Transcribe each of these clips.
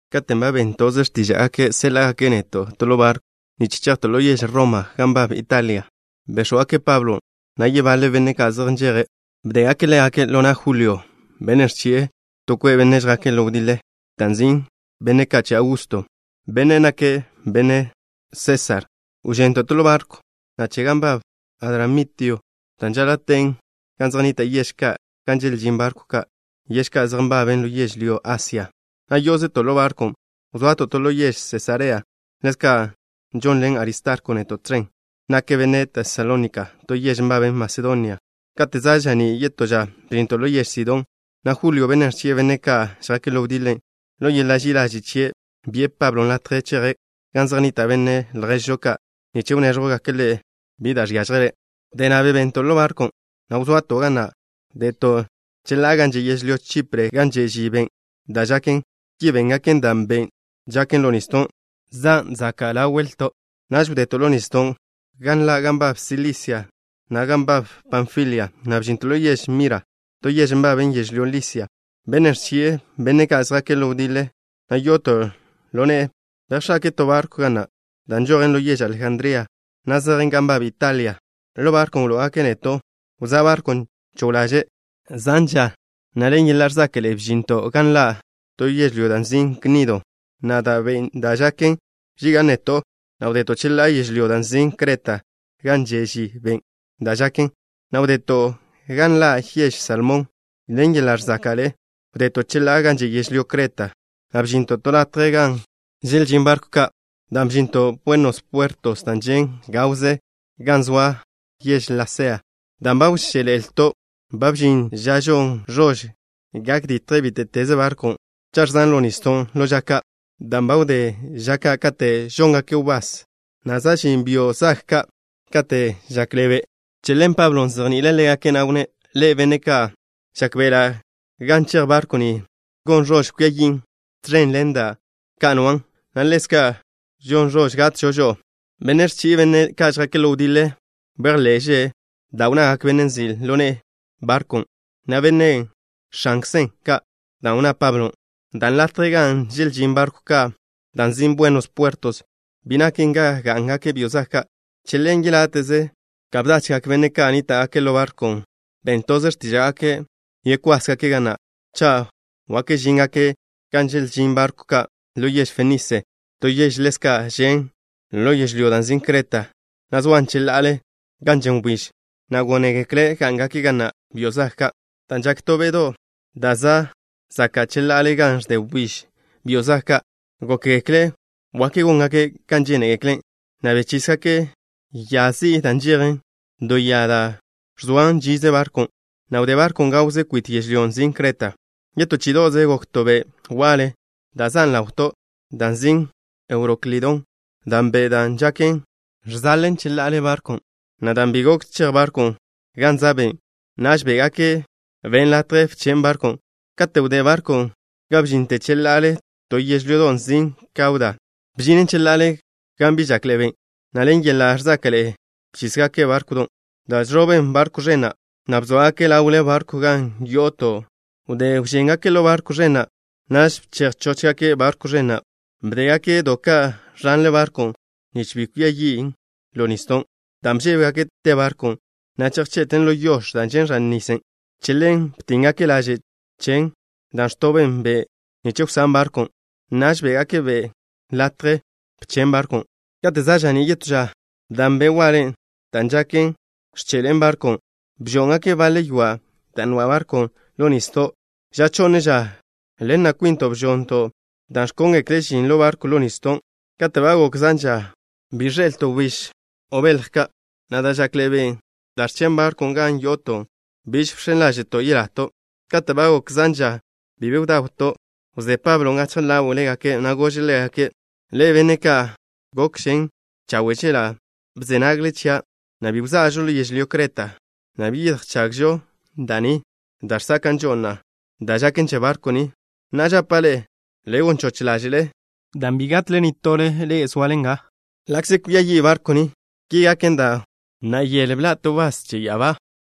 Katen' ba ben toze x̱tíža'gake' séḻa'gake' neto' to ḻo barkw nich chejto' ḻo yež Roma, gan nbab Italia, béx̱wgake' Pablo, na' yebaḻe benne' ka' zej nžeje'. Bdégake' ḻégake' ḻo na' Julio, benne' ẕchi'e to kwe' benne' žjake' ḻo wdiḻe, da' nzin': Benne' Ka' Che Augusto, bennen' nake' benne' Sésar. Wžento' to ḻo barkw che gan nbab Adramitio, dan' žaḻa' ten gan zej nnita' yež ka' gan želžín barkw ka', yež ka' zej nbaben ḻo yežlyó Asia, na' yó'ozeto' ḻo barkwn', wza'to' ḻo yež Sesarea. Ḻezka' žonḻen Aristarko neto' tẕen. Nake' benne' Tesalónika, to yež nbaben Masedonia. Kate' za' ža'ní' yetó ža, bžinto' ḻo yež Sidón, na' Julio, bennen' ẕchi'e benne' ka' žjake' ḻo wdiḻe, ḻo yeḻa' ži'i ḻaže' chie', bi'e Pablon' latje cheje' gan zej nnita' benne' lježžo ka' nich wnéẕjwgake' ḻe' bi da' žiážjele'. Wdé na', bebento' ḻo barkwn', na' wza'to' ga na'. Wdeto' cheḻá'a gan že' yežlyó Chipre gan že' ži ben' da' žaken. Ki béngake' dan' ben' da' žaken ḻo nisdo', zan' zaka' ḻawto'. Naž wdeto' ḻo nisdon' gan nḻa' gan nbab Silisia, na' gan nbab Panfilia, na' bžinto' ḻo yež Mira, to yež nbaben yežlyó Lisia. Bennen' ẕchi'e benne' ka' žjake' ḻo wdiḻe, na' yo'oto' ḻo ne'e, bejx̱ake'e to barkw ga na' da' nžojen ḻo yež Alejandría, na' zejen gan nbab Italia. Ḻo barkwn' wló'ogake' neto'. Wzá' barkwn' cho ḻaže' zan ža, na' ḻen yeḻa' ẕzáka'ḻe'e bžinto' gan nḻa' to yežlyó da' nzin' Gnido, na' dan' ben' da' žaken bžiga' neto', na' wdeto' cheḻá'a yežlyó da' nzin' Creta gan že' ži ben' da' žaken, na' wdeto' gan nḻa' yež Salmón. Ḻen yeḻa' ẕzáka'ḻe'e wdeto' cheḻá'a gan že' yežlyó Cretan', na' bžinto' to latje gan želžín barkw ka', da' nzin' Buenos Puertos, dan' žen' gawze gan zoa yež Lasea. Dan' ba wžél-ḻe'eto', ba bžin ža žon ẕož gak ditje bíte'teze barkw cha' ẕzan' ḻo nisdo' ḻo ža ka', dan' ba wdé ža ka' kate' žóngake' wbás, na' za' žin byo' zag ka' kate' žakḻe'e be'. Che ḻen Pablon' bzejni'ile' ḻégake', na' wnné': —Ḻe'e, benne' ka', žákbe'ela' gan chej barkw ni, gon ẕož kwia yin', tẕen ḻen da' ka' nwan', na' ḻezka' gon ẕož gatžo žo'o. Bennen' ẕchi'e benne' ka' žjake' ḻo wdiḻe bejḻe'že' da' wnnagak bennen' nzi' ḻo ne'e barkwn', na' benne' x̱ankzen, ka dan' wnná Pablon'. Dan' latjen' gan želžín barkw ka', dan' nzin' Buenos Puertos, bi naken ga gá'ngake' byo' zag ka', che ḻen yeláte'ze ka bdachgak benne' ka' nníta'gake' ḻo barkwn' ben toze x̱tíža'gake' yekwásgake' ga na', cha' wak žíngake' gan želžín barkw ka' ḻo yež Fenise, to yež ḻezka' žen' ḻo yežlyón' da' nzin' Creta, na' zoan cheḻa'ale gan žen wbíž, na' gónegekle' gá'ngake' ga na' byo' zag ka'. Dan' žaken to be'do' da' za' zaka' cheḻa'ale gan ẕde wbíž byo' zag ka', gókgekle' wak góngake' kan žénegekle', na' bechísgake' ya zi'i da' nžejen do ya da' ẕzoan žize barkwn', na' wdé barkwn' gawze kwit yežlyón' nzin' Creta. Yetó chí'ido'ze, gok to be' waḻe da' zan' ḻawto', dan' nzin' Euroklidón. Dan' ben' da' žaken ẕzejen cheḻa'ale barkwn', na' dan' bi gok chej barkwn' gan za' ben', naž bé'gake' ben' latje bchen' barkwn'. Kate' wdé barkwn' ga bžinten cheḻa'ale to yežlyodo' nzin' Kauda, bžinen cheḻa'ale gan bi žakḻe'e ben', na' ḻen yeḻa' ẕzáka'ḻe'e bchísgake' bárkwdon', da' žẕoben barkw ẕen na', na' bzóagaken' ḻawle barkwn' gan yo'oto'. Wdé bžéngaken' ḻo barkw ẕen na', naž bchej chóchgake' barkw ẕen na'. Bdégake' do ka' ẕanle barkwn', nich bi kwia yin' ḻo nisdo'. Dan' bžébegake' te barkwn', na' chejche'ten ḻo yož da' žen' ẕan nisen', che ḻen btíngake' laže' chen, da' ẕtoben be' nich wsán' barkwn'. Naž bé'gake' ben' latje bchen' barkwn'. Kate' za' ža'ní' yetó ža, dan' be' waḻe da' žaken ẕche'ḻe'en barkwn', bžó'ngake' baḻe ywa' da' nwa' barkwn' ḻo nisdo'. Ža chonne ža, ḻen na' kwinto' bžo'nto' da' ẕkóngekle' žin ḻo barkwn' ḻo nisdon'. Kate' ba gok zan ža bi ẕḻe'elto' wbíž o belj ka', na' dan' žakḻe'e ben' da' ẕchen' barkwn' gan yo'oto', biž bx̱en ḻáže'to' yelato'. Kate' ba gok zan ža bi be bdawto', wzé Pablon' gachje ḻáwe'legake', na' gože' ḻégake': —Ḻe'e, benne' ka', gokžen chawe' chela' bze nagle chia', na' bi wza'žo ḻo yežlyó Creta, na' bi yedjchagžo da' ni da' ẕzáka'žo, na' da' žaken che barkw ni. Na'a, žapa' ḻe'e: le gon choch ḻáže'le, dan' bi gatle nitole ḻe'e zoale nga, ḻa'kze kwia yi' barkw ni. Ki gaken dan' wdé yele bḻa' to wbás che ya'abá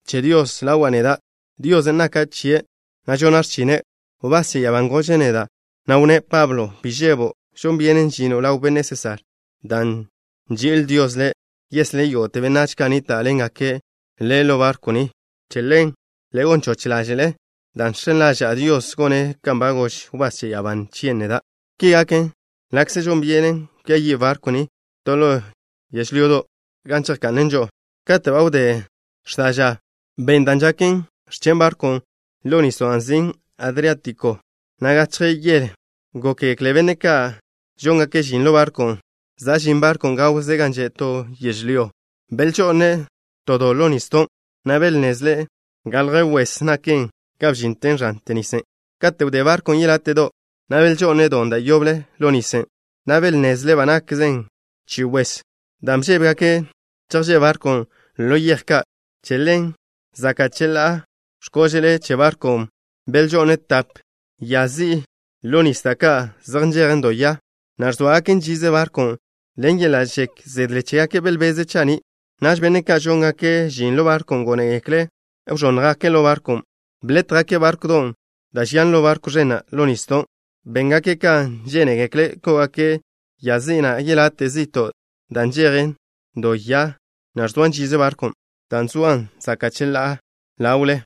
che Dios ḻawa' neda'. Diosen' naka' chie', na' žona' x̱chine'. Wbás che ya'abán' gože' neda', na' wnné': “Pablo, bi žebo'. Žon byenen žino' ḻaw benne' Sésar. Dan' nži'il Dios le', yeslé' yógo'te benách ka' nníta'ḻengake' le' ḻo barkw ni.” Che ḻen, le gon choch ḻáže'le, dan' žx̱en ḻaža'a Dios, gone' kan ba gož wbás che ya'abá chie' neda'. Ki gaken ḻa'kze žon byenen kwia yi' barkw ni to ḻo yežlyodo', gan chejka'nen žo'o. Kate' ba wdé x̱da' ža, ben' da' žaken ẕchen' barkwn' ḻo nisdo' da' nzin' Adriátiko, na' gachje yele gókgekle benne' ka' žóngake' žin ḻo barkwn' za' žin barkwn' gawze gan že' to yežlyó. Belžo'ne' to do ḻo nisdon', na' belnnezle' galje wes naken ga bžinten ẕante nisen'. Kate' wdé barkwn' yeláte'do', na' belžo'ne' don' da' yoble ḻo nis, na' belnnezle' ba nakzen chi wes. Dan' bžébegake' chejžé' barkwn' ḻo yej ka', che ḻen, zaka' cheḻá'a x̱kóže'le che barkwn' belžo'ne' tape ya zi'i ḻo nis, da' ka' zej nžejen do ya, na' ẕzóagaken žize barkw. Ḻen yeḻa' žek zedle chégake' belbeze' cha'ní'. Naž benne' ka' žóngake' žin ḻo barkwn' gónegekle' wẕónnjgake' ḻo barkwn'. Blétjgake' bárkwdon' da' žian ḻo barkw ẕen na' ḻo nisdo'. Béngake' ka žénegekle' kó'ogake' ya zi'i na' yelate' zi'to', da' nžejen do ya, na' ẕzoan žize barkwn', dan' zoan zaka' cheḻá'a ḻawle.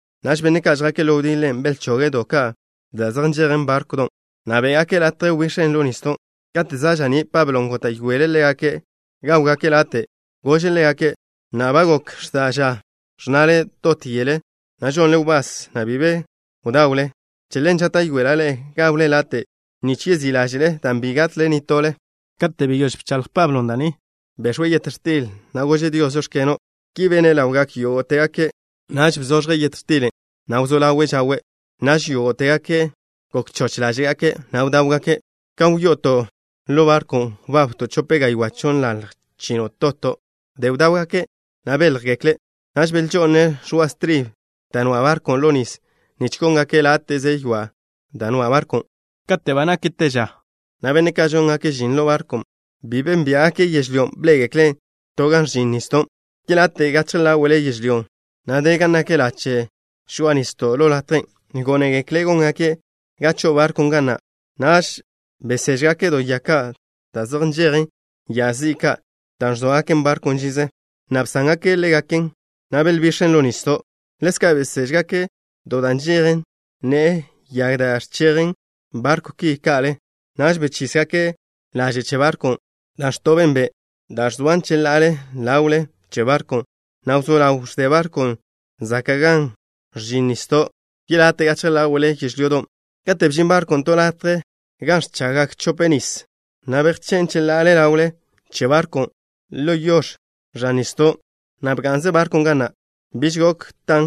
Naž benne' ka' žjake' ḻo wdiḻe belchoge' do ka' da' zej nžejen bárkwdon', na' bé'gake' latje wbix̱en ḻo nisdo'. Kate' za' ža'ní', Pablon' góta'yoele' ḻégake' gáwgake' late'. Gože' ḻégake': —Na'a ba gok x̱da' ža ẕnna'le dot yele, na' žonle wbás, na'bi be bdawle. Che ḻen, žáta'yoela' ḻe'e gawle late' nich yeyák ḻáže'le, dan' bi gatle nitole ḻe'e. Kate' beyóž bchaḻj Pablon' da' ni, bex̱we' yet x̱til, na' gože' Dios: “Žóx̱keno'.” Ki bene' ḻawgak yógo'tegake'. Naž bzoẕje' yet x̱tilen', na' wzó ḻawe' žawe'. Naž yógo'tegake' gok choch ḻáže'gake', na' bdáwgake'. Ka wyo'oto' ḻo barkwn', wbabto' chope gaywá' chonnḻalj chino' toto'. Wdé bdáwgake', na' béljegekle', naž belžo'ne' ẕoa' stribe da' nwa' barkwn' ḻo nis, nich góngake' láte'že ywa' da' nwa' barkwn'. Kate' ba nak te ža, na' benne' ka' žóngake' žin ḻo barkwn' bi bénbia'gake' yežlyón'. Bḻé'egekle' to gan ẕžin nisdon' yelate' gachje ḻáwe'le yežlyón', na' de gan nak lache' žoa'a nisdo' ḻo latjen'. Gónegekle' góngake' ga cho'o barkwn' ga na'. Naž beséžgake' do ya ka' da' zej nžejen ya zi'i ka' da' ẕzóagaken barkwn' žize, na' bsángake' ḻégaken, na' belbix̱en ḻo nisdo'. Ḻezka' beséžgake' do da' nžejen ne'e yag da' ẕzechjen barkwn' ki ka'le. Naž bechísgake' laže' che barkwn', da' ẕtoben be', dan' zoan cheḻá'a ḻawle che barkwn', na' wzó ḻaw ẕde barkwn' zaka' gan ẕžin nisdo' yelate' gachje ḻáwe'le yežlyodon'. Kate' bžin barkwn' to latje gan ẕchaggak chope nis, na' bejché' cheḻá'a ḻawle che barkwn' ḻo yož ẕan nisdon', na' bga'nze barkwn' ga na'. Biž gok tan,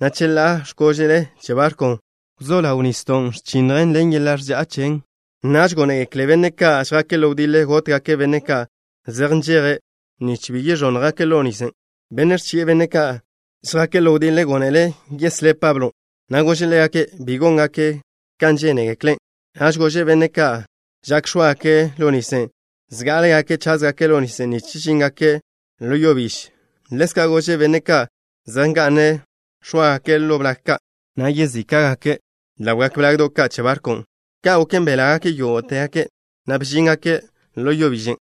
na' cheḻá'a x̱kóže'le che barkwn', wzó ḻaw nisdon' ẕchinnjen ḻen yeḻa' ẕza' chen. Naž gónegekle benne' ka' žjake' ḻo wdiḻe gótgake' benne' ka' zej nžeje', nich bi x̱óagake' ḻo nis, na' bi wẕónnjgake'. Bennen' ẕchi'e benne' ka' žjake' ḻo wdiḻe gónele' yeslé' Pablon', na' gože' ḻégake' bi góngake' kan žénegekle'. Naž gože' benne' ka' žak x̱óagake' ḻo nis, zgá'alegake' cházgake' ḻo nis nich žíngake' ḻo yo biž. Ḻezka' gože' benne' ka' zej nga'ne' x̱óagake' ḻo blag ka', na' yezíka'gake' ḻawgak blagdo' ka' che barkwn'. Ka' goken, belágake' yógo'tegake', na' bžíngake' ḻo yo biẕen'.